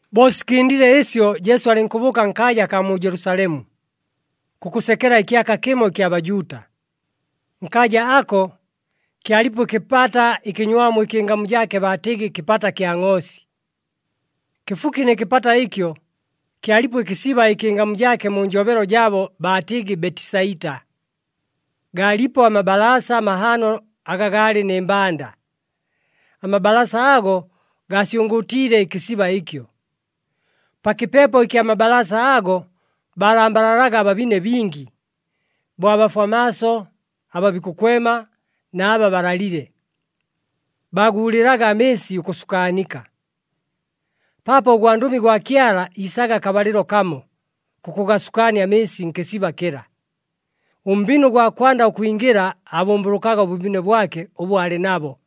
Bo sikɨndile ɨsyo, Jesu alɨnkʉbʉʉka nkaaja akaa mu Jelusalemu, kʉkʉsekela ɨkyaka kɨmo ɨkya Bajuuta. Nkaaja ako, kyalipo ɨkɨpata ɨkɨnywamu ɨkɨ ɨngamu jaake baatɨgɨ, Kɨpata kya Ngʼoosi. Kɨfuki nɨ kɨpata ɨkyo, kyalipo ɨkɨsiba ɨkɨ ɨngamu jaake mu njobelo jaabo baatɨgɨ Betisaita. Gaalipo amabalaasa mahaano aga gaalɨ nɨ mbanda. Amabalaasa ago gaasyʉngʉʉtiile ɨkɨsiba ɨkyo. Pa kɨpepo ɨkya mabalaasa ago, baalambalalaga ababine bingi, bo abafwa maaso, aba bikʉkwema, na aba balalile. [Baaguulɨlaga amɨɨsi ʉkʉsukaanika, paapo ʉgwandʉmi gwa Kyala iisaga akabalɨlo kamo kʉkʉgasukaania amɨɨsi nkɨsiba kɨla. Ʉmbine ʉgwa kwanda ʉkwingɨla aabʉmbʉlʉkaga ʉbʉbine bwake ʉbʉ aalɨ nabo.]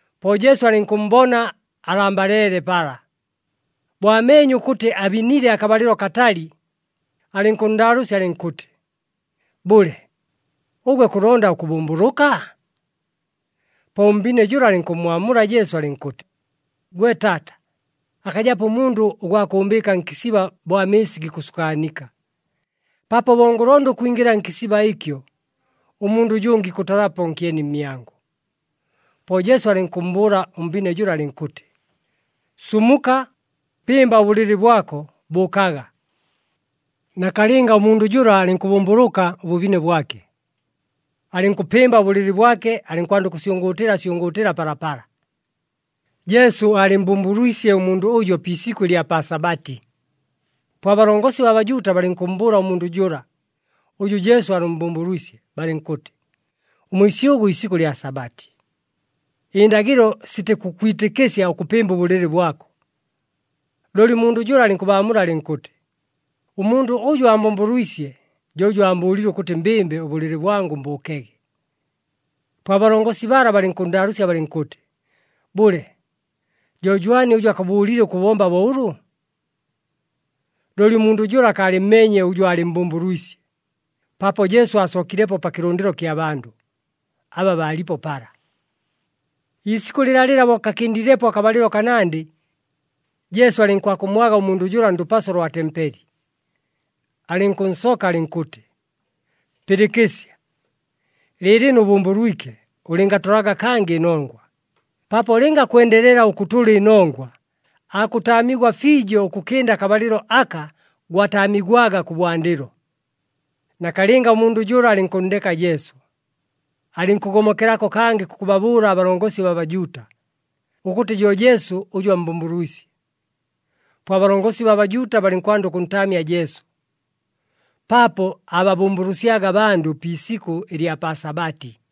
Po Jesu alɨnkʉmmbona alambaleele pala. Bo ameenye ʉkʉtɨ abinile akabalɨlo akatali, alɨnkʉnndaalʉʉsya alɨnkʉtɨ, “Bʉle, ʉgwe kʉlonda ʉkʉbʉmbʉlʉka?” Po ʉmbine jʉla alɨnkʉmmwamula Jesu alɨnkʉtɨ, “Gwe taata, akajapo ʉmundʉ ʉgwa kʉʉmbɨɨka nkɨsiba bo amɨɨsi gikʉsukaanika. Paapo bo ngʉlonda ʉkwingɨla nkɨsiba ɨkyo, ʉmundʉ ʉjʉngɨ ikʉtalapo nkyeni mmyangʉ.” Po Jesu alɨnkʉmmbʉʉla ʉmbine jʉla alɨnkʉtɨ, “Sumuka, pɨmba ʉbʉlɨlɨ bwako, bʉʉkaga.” Nakalɨnga, ʉmundʉ jʉla alɨnkʉbʉmbʉlʉka ʉbʉbine bwake, alɨnkʉpɨmba ʉbʉlɨlɨ bwake alɨnkwanda ʉkʉsyʉngʉʉtɨla syʉngʉʉtɨla palapala. Jesu aalɨmmbʉmbʉlwisye ʉmundʉ ʉjo pi isikʉ ɨlya pa Sabati. Po abalongosi baa Bajuuta balɨnkʉmmbʉʉla ʉmundʉ jʉla, ʉjʉ Jesu aalɨmmbʉmbʉlwisye balɨnkʉtɨ, “Ʉmwisyʉgʉ isikʉ lya Sabati, ɨndagɨlo sitikʉkwitɨkɨsya ʉkʉpɨmba ʉbʉlɨlɨ bwako.” Looli ʉmundʉ jʉla alɨnkʉbaamula alɨnkʉtɨ, “Ʉmundʉ ʉjʉ aambʉmbʉlwisye jo ʉjʉ aambʉʉlile ʉkʉtɨ mbɨmbe ʉbʉlɨlɨ bwangʉ mbʉʉkege.” Po abalongosi bala balɨnkʉnndaalʉʉsya balɨnkʉtɨ, “Bʉle, jo jwani ʉjʉ akʉbʉʉlile ʉkʉbomba bo ʉlʉ?” Looli ʉmundʉ jʉla akaalɨmmeenye ʉjʉ aalɨmmbʉmbʉlwisye, paapo Jesu aasookilepo pa kɨlʉndɨlo kya bandʉ, aba baalipo pala. Ɨliisikʉ lɨlalɨla bo kakɨndilepo akabalɨlo kanandɨ, Jesu alɨnkwakʉmmwaga ʉmundʉ jʉla ndʉpaso lwa tempeli, alɨnkʉnsoka alɨnkʉtɨ, “Pɨlɨkɨsya, lɨɨlɨno ʉbʉmbʉlwike. Ʉlɨngatʉlaga kangɨ ɨnongwa, paapo lɨnga kwendelela ʉkʉtʉla ɨnongwa, aakʉtaamigwa fiijo ʉkʉkɨnda akabalɨlo aka gwataamigwaga kʉbwandɨlo.” Nakalɨnga, ʉmundʉ jʉla alɨnkʉnndeka Jesu, alɨnkʉgomokelako kangɨ kʉkʉbabʉʉla abalongosi baa Bajuuta, ʉkʉtɨ jo Jesu ʉjʉ ammbʉmbʉlwisye. Po abalongosi baa Bajuuta balɨnkwanda ʉkʉntaamya Jesu, paapo aababʉmbʉlʉsyaga abandʉ pi isikʉ ɨlya pa Sabati.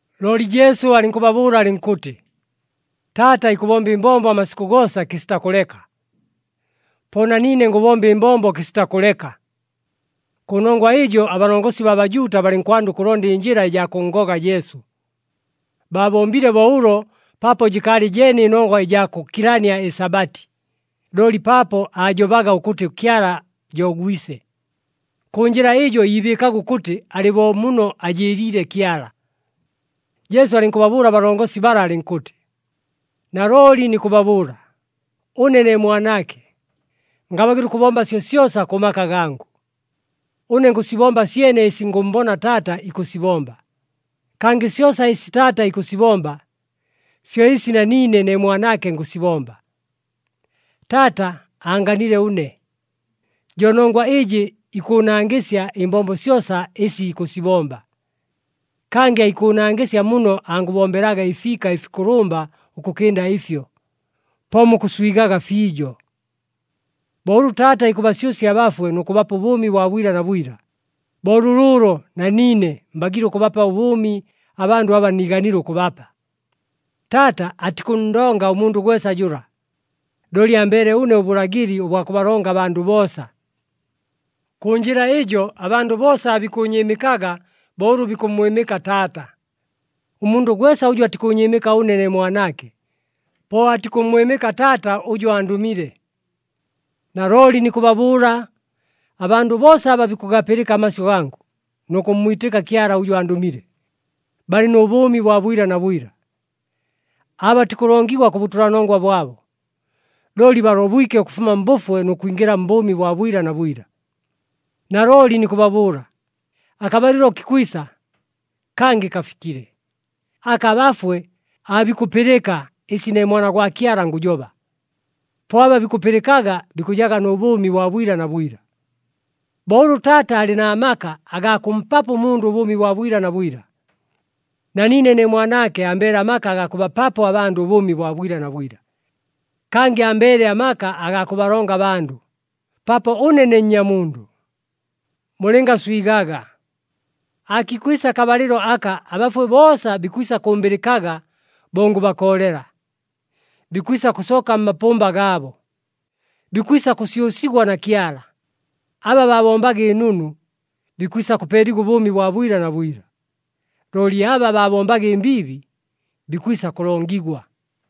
Looli Jesu alɨnkʉbabʉʉla alɨnkʉtɨ, “Taata ikʉbomba ɨmbombo amasikʉ goosa kɨsita kʉleka. Po na niine ngʉbomba ɨmbombo kɨsita kʉleka.” Kʉnongwa ɨjo, abalongosi baa Bajuuta balɨnkwanda ʉkʉlonda ɨnjɨla ɨjaa kʉnngoga Jesu. Baabombile bo ʉlo paapo jɨkaalɨ jeene ɨnongwa ɨjaa kʉkilania ɨSabati, looli paapo aajobaga ʉkʉtɨ Kyala jo Gwise. Kʉ njɨla ɨjo iibɨɨkaga ʉkʉtɨ alɨ bo muno ajɨɨliile Kyala. Jesu alɨnkʉbabʉʉla abalongosi bala alɨnkʉtɨ, “Nalooli nikʉbabʉʉla, ʉne ne Mwanaake, ngabagɨla ʉkʉbomba syosyosa kʉ maka gangʉ. Ʉne ngʉsibomba syene ɨsi ngʉmmbona Taata ikʉsibomba, kangɨ syosa ɨsi Taata ikʉsibomba, syo ɨsi na niine ne Mwanaake ngʉsibomba. Taata aanganile ʉne, jo nongwa ɨjɨ ikʉʉnangɨsya ɨmbombo syosa ɨsi ikʉsibomba, kangɨ aikʉʉnangɨsya muno angʉbombelaga ɨfiika ɨfikʉlʉmba ʉkʉkɨnda ɨfyo, po mukʉswigaga fiijo. Bo ʉlʉ Taata ikʉbasyʉsya abafwe nʉ kʉbapa ʉbʉʉmi bwa bwila na bwila, bo lʉlʉʉlo na niine mbagiile ʉkʉbapa ʉbʉʉmi abandʉ aba niiganile ʉkʉbapa. Taata atikʉnndonga ʉmundʉ gwesa jʉla, looli ambeele ʉne ʉbʉlagɨli ʉbwa kʉbalonga abandʉ boosa. Kʉ njɨla ɨjo, abandʉ boosa aabikʉʉnyɨɨmɨkaga bo ʉlʉ bikʉmmwɨmɨka Taata. Ʉmundʉ gwesa ʉjʉ atikʉʉnyɨɨmɨka ʉne ne Mwanaake, po atikʉmmwɨmɨka Taata ʉjʉ andʉmile. “Nalooli nikʉbabʉʉla, abandʉ boosa aba bikʉgapɨlɨka amasyʉ gangʉ nʉ kʉmmwitɨka Kyala ʉjʉ andʉmile, balɨ nʉ bʉʉmi bwa bwila na bwila. Aabatikʉlongigwa kʉ bʉtʉlanongwa bwabo, looli balobwike ʉkʉfuma mbʉfwe nʉ kwingɨla mbʉʉmi bwa bwila na bwila. Nalooli nikʉbabʉʉla, akabalɨlo kikwisa, kangɨ kafikile, aka abafwe aabikʉpɨlɨka ɨsi ne Mwana gwa Kyala ngʉjoba. Po aba bikʉpɨlɨkaga, bikʉjaga nʉ bʉʉmi bwa bwila na bwila. Bo ʉlʉ Taata alɨ na maka agaa kʉmpapo ʉmundʉ ʉbʉʉmi bwa bwila na bwila, na niine ne Mwanaake ambeele amaka aga kʉbapapo abandʉ ʉbʉʉmi bwa bwila na bwila. Kangɨ ambeele amaka agaa kʉbalonga abandʉ, paapo ʉne ne Nnyamundʉ. Mulɨngaswigaga! Aakikwisa akabalɨlo aka abafwe boosa bikwisa kʉmbɨlɨkaga bo ngʉbakoolela, bikwisa kʉsooka mmapʉmba gaabo, bikwisa kʉsyʉsigwa na Kyala. Aba baabombaga ɨnunu, bikwisa kʉpeeligwa ʉbʉʉmi bwa bwila na bwila, looli aba baabombaga ɨmbiibi, bikwisa kʉlongigwa.”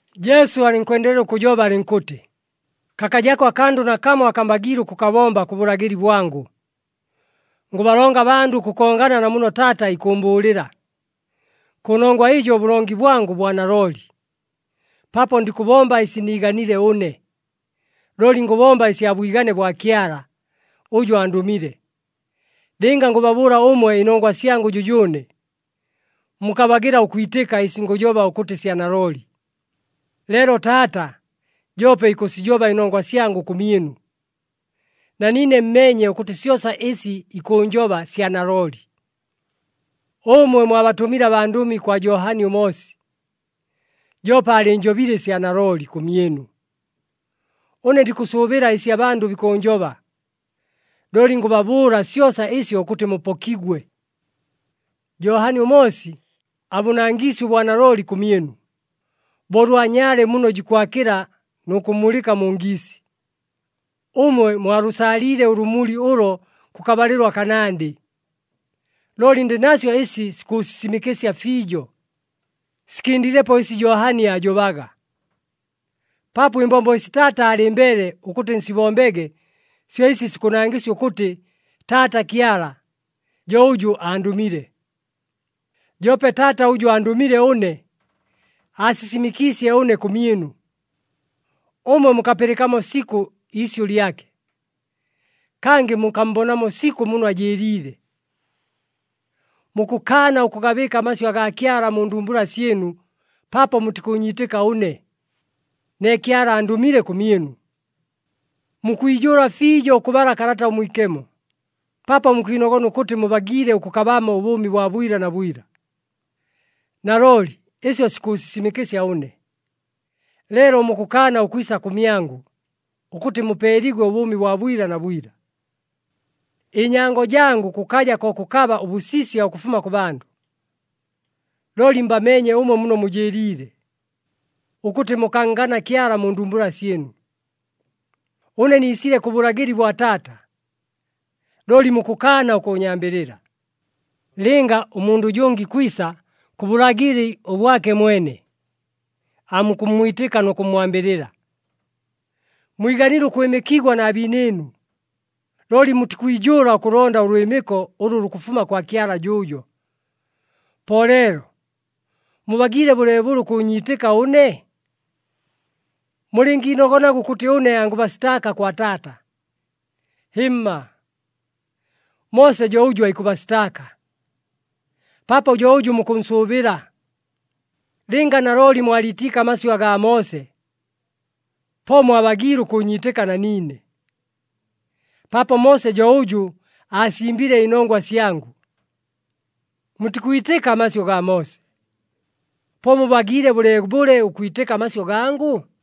Jesu alɨnkwendelela ʉkʉjoba alɨnkʉtɨ, “Kakajako akandʉ nakamo aka mbagiile ʉkʉkabomba kʉ bʉlagɨli bwangʉ. Ngʉbalonga abandʉ ʉkʉkongana na muno Taata ikʉʉmbʉʉlɨla. Kʉnongwa ɨjo ʉbʉlongi bwangʉ bwa nalooli, paapo ndikʉbomba ɨsi niiganile ʉne, looli ngʉbomba ɨsya bwigane bwa Kyala, ʉjʉ andʉmile. Lɨnga ngʉbabʉʉla ʉmwe ɨnongwa syangʉ jʉjʉʉne, mukabagɨla ʉkwitɨka ɨsi ngʉjoba ʉkʉtɨ sya nalooli. Leelo Taata joope ikʉsijoba ɨnongwa syangʉ kʉmyɨnu, na niine mmeenye ʉkʉtɨ syosa ɨsi ikʉʉnjoba sya nalooli. Ʉmwe mwabatʉmile abandʉmi kwa Johani ʉMoosi, joope aalɨɨnjobile ɨsya nalooli kʉmyɨnu. Ʉne ndikʉsʉʉbɨla ɨsi abandʉ bikʉʉnjoba, looli ngʉbabʉʉla syosa ɨsyo ʉkʉtɨ mupokigwe. “Johani ʉMoosi abʉnangiisye ʉbwanalooli kʉmyɨnu, bo ʉlwa nyaale muno jikwakɨla nʉ kʉmulɨka mu ngiisi. Ʉmwe mwalʉsaaliile ʉlʉmuli ʉlo kʉkabalɨlo akanandɨ. Looli ndɨ nasyo ɨsi sikʉʉsisimɨkɨsya fiijo, sikɨndilepo ɨsi Johani aajobaga. Paapo ɨmbombo ɨsi Taata aalɨmbeele ʉkʉtɨ nsibombege syo ɨsi sikʉnangɨsya ʉkʉtɨ Taata Kyala, jo ʉjʉ andʉmile. Joope Taata ʉjʉ andʉmile ʉne, aasisimɨkiisye ʉne kʉmyɨnu. Ʉmwe mukapɨlɨkamo sikʉ iisyʉ lyake, kangɨ mukammbonamo sikʉ muno ajɨɨliile. Mukʉkaana ʉkʉgabɨɨka amasyʉ agaa Kyala mu ndumbula syɨnu paapo mutikʉʉnyiitɨka ʉne, ne Kyala andʉmile kʉmyɨnu. Mukwijʉʉla fiijo ʉkʉbala Kalata ʉMwikemo, paapo mukwinogona ʉkʉtɨ mubagiile ʉkʉkabamo ʉbʉʉmi bwa bwila na bwila. Nalooli ɨsyo sikʉʉsisimɨkɨsya ʉne, leelo mukʉkaana ʉkwisa kʉmyangʉ, ʉkʉtɨ mupeeligwe ʉbʉʉmi bwa bwila na bwila. “Ɨnyango jangʉ kʉkaja ko kʉkaba ʉbʉsisya ʉkʉfuma kʉ bandʉ. Looli mbameenye ʉmwe muno mujɨɨliile, ʉkʉtɨ mukanngana Kyala mu ndumbula syɨnu. Ʉne niisile kʉ bʉlagɨli bwa Taata, looli mukʉkaana ʉkʉʉnyambɨlɨla. Lɨnga ʉmundʉ ʉjʉngɨ ikwisa kʉ bʉlagɨli ʉbwake mwene, aamukʉmmwitɨka nʉ kʉmmwambɨlɨla. Mwiganile ʉkwɨmɨkigwa na biinɨɨnu, looli mutikwijʉʉla ʉkʉlonda ʉlwɨmɨko ʉlʉ lukʉfuma kwa Kyala jʉʉjo. Po leelo, mubagiile bʉleebʉle ʉkʉʉnyiitɨka ʉne? “Mulɨngiinogonaga ʉkʉtɨ ʉne angʉbasitaaka kwa Taata. Hɨmma! Moose jo ʉjʉ aikʉbasitaaka, paapo jo ʉjʉ mukʉnsʉʉbɨla. Lɨnga nalooli mwaliitiike amasyʉ agaa Moose, po mwabagiile ʉkʉʉnyiitɨka na niine, paapo Moose jo ʉjʉ aasimbile ɨnongwa syangʉ. Mutikwitɨka amasyʉ gaa Moose. Po mubagiile bʉleebʉle ʉkwitɨka amasyʉ gangʉ?”